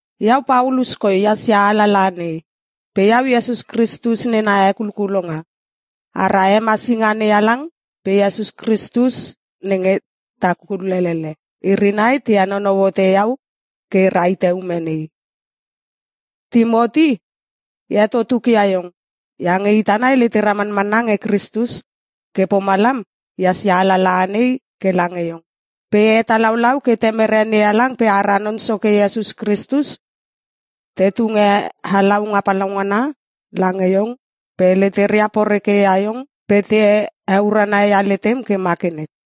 Iau Paulus koi ehas ia alalaha nei, pe iau Iesus Kristus nena hekulkulonga. Ara hemasinga NeHalang pe Iesus Kristus nenge ta kulelele, iri nai te henonou hote iau ke e rahite ume nei. Timoti, e heto tukia iong iange ita nai letera manmanna nge Kristus. Ke pomalam ehas ia alalaha nei ke lange iong. Pe e hetalaulau ke Temere NeHalang pe ara Non Soke Iesus Kristus te tunge halaunga palaungana lange iong pe leteria porekeia iong pe te heurana ia letem ke ma ke nek.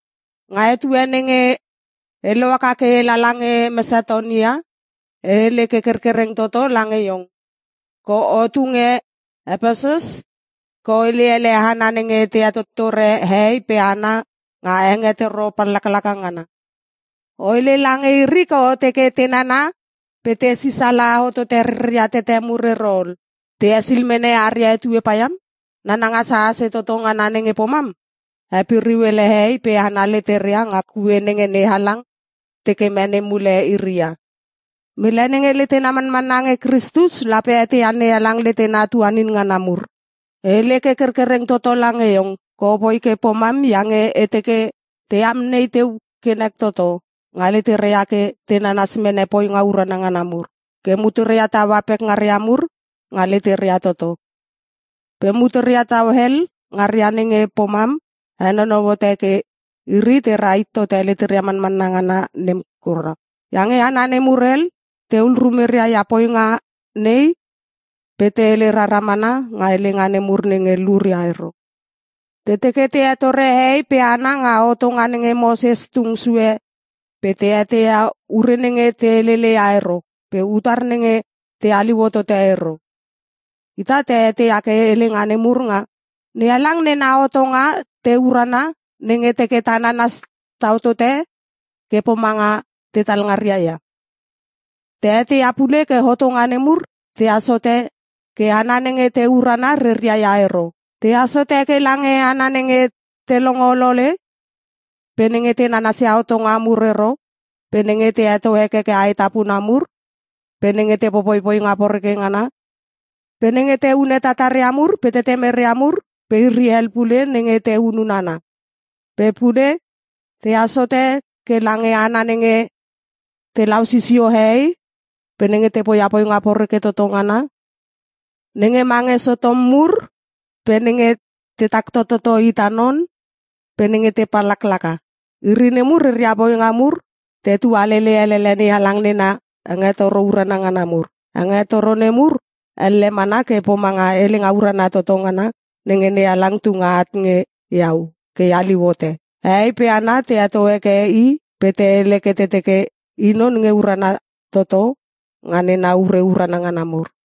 Nga etue nenge e lohaka ke e lala nge Mesatonia e hele ke kerkereng toto lange iong ke otu nge Epesus ke o hele ele hana nenge te hetottore hehei pe hana nga hengetoro pallaklaka ngana. O hele lange iri ke o teke te nana pe te sisala hotote reria tete mur ero ol, te esil mene aria etue paiam. Nananga sasase toto ngana nenge pomam, hepiriu ele hehei pe hana leteria nga kue nenge NeHalang teke mene mule iri ia. Mele nenge letena manmanna nge Kristus lape eteia NeHalang letena tuanin ngana mur. E hele ke kerkereng toto lange iong ke opoi ke pomam iange e teke te amnei teu ke nek toto nga leteria ke te nanas mene poinga urana ngana mur, ke muteria taua pekngaria mur nga leteria toto. Pe muteria tau hel ngaria nenge pomam henonou hote ke iri te rahit tote leteria manmanna ngana nem kura. Iange hana nemur hel tehul rumeria nga poinga nei pe te hele rara mana nga helenga nemur nenge luria ero. Te teke te hetore hehei pe hana nga hotonga nenge Moses tung sue pe te eteia ure nenge te heleleia ero pe utar nenge te haliu hotote ero. Ita ta eteia ke helenga nemur nga NeHalang nena hotonga te urana, nenge teke ta nanas tau tote ke pomanga tetal ngaria ia. Ta eteia pule ke hotonga nemur tehas hote ke hana nenge te urana reria ia ero. Tehas hote ke lange hana nenge te longo olole pe nenge te nanasia hotonga mur ero pe nenge te heto hekeke aetapuna mur pe nenge te popoi poinga poreke ngana pe nenge te hune tataria mur pe tetemeria mur pe iri hel pule nenge te hunun hana. Pe pule tehas hote ke lange hana nenge telau sisio hehei pe nenge te poia poinga poreke toto ngana nenge mange Sotom mur pe nenge tetak tototo ita non pe nenge te pallaklaka. Iri nemur reria poinga mur te tualele elele NeHalang nena hengetoro urana ngana mur. Hengetoro nemur elle mana ke pomanga Helenga Urana Toto Ngana nenge NeHalang tunge at nge iau ke e haliu hote. Hehei pe hana te heto heke I pe te hele ke te teke I non nge urana toto nga nena ure urana ngana mur.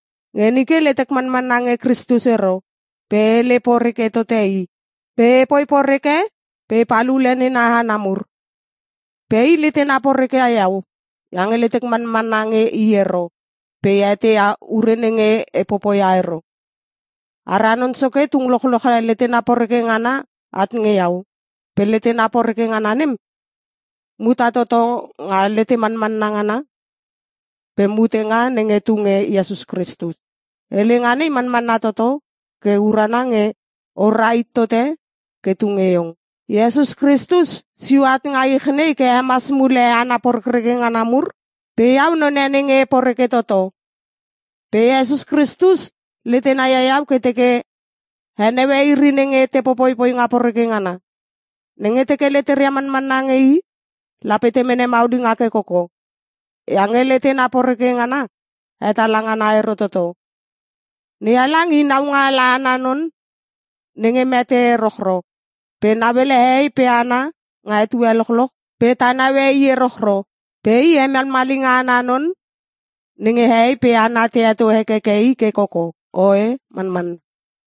Nge nike letek manmanna nge Kristus ero pe e hele poreke tote I. Pe epoi poreke pe epal ule nena hana mur. Pe I letena porekeia iau iange letek manmanna nge I ero pe e eteia ure nenge e popoia ero. Ara Non Soke tung lochloche letena poreke ngana at nge iau pe letena poreke ngana nem muta toto nga letemanmanna ngana pe mutenga nenge tu nge Iesus Kristus. Helenga nei manmanna toto ke urana nge o rahit tote ke tunge iong: Iesus Kristus sio at nga ich nei ke hemas mule hana porekreke ngana mur pe iau none nenge e poreke toto. Pe Iesus Kristus letena ia iau ke teke heneue iri nenge te popoi poinga poreke ngana. Nenge teke leteria manmanna nge I lape te mene maulinga ke koko, iange letena poreke ngana hetala ngana ero toto. NeHalang i naungaala ana non nenge mete erochro pe nauele hehei pe hana nga etue lochloch pe ta naue i erochro. Pe I hemalmalinga ana non nenge hehei pe hana te heto hekeke ke koko. Oe, Manmanna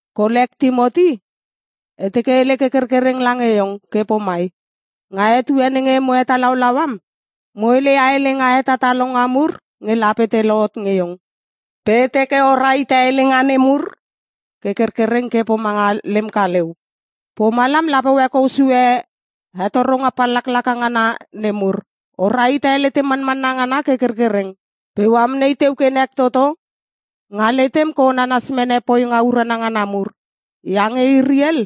Kolek Timoti, e teke e hele ke kerkereng lange iong ke pomai. Nga etue nenge mo hetalau am, mo hele ia helenga hetatalonga mur nge lape te lohot nge iong. Pe e teke o rahite helenga nemur ke kerkereng ke pomanga lem kaleu. Pomalam lape o hekou sue hetoronga pallaklaka ngana nemur. O rahite letem manmanna ngana ke kerkereng pe o amnei teu ke nek toto nga letem ke o nanas mene poinga urana ngana mur. Iange iri hel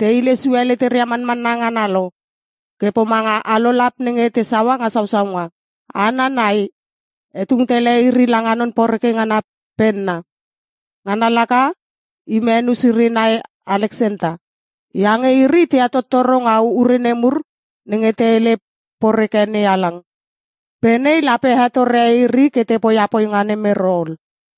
te hile sue leteria manmanna ngana lo ke pomanga alolap nenge te saua nga sausaunga. Hana nai, e tung tele iri langa non poreke ngana penna. Ngana laka Imenus iri nai Aleksenta. Iange iri te hetottoro nga ure nemur nenge te hele poreke NeHalang. Pe nei lape hetore iri ke te poia poinga nem ero ol.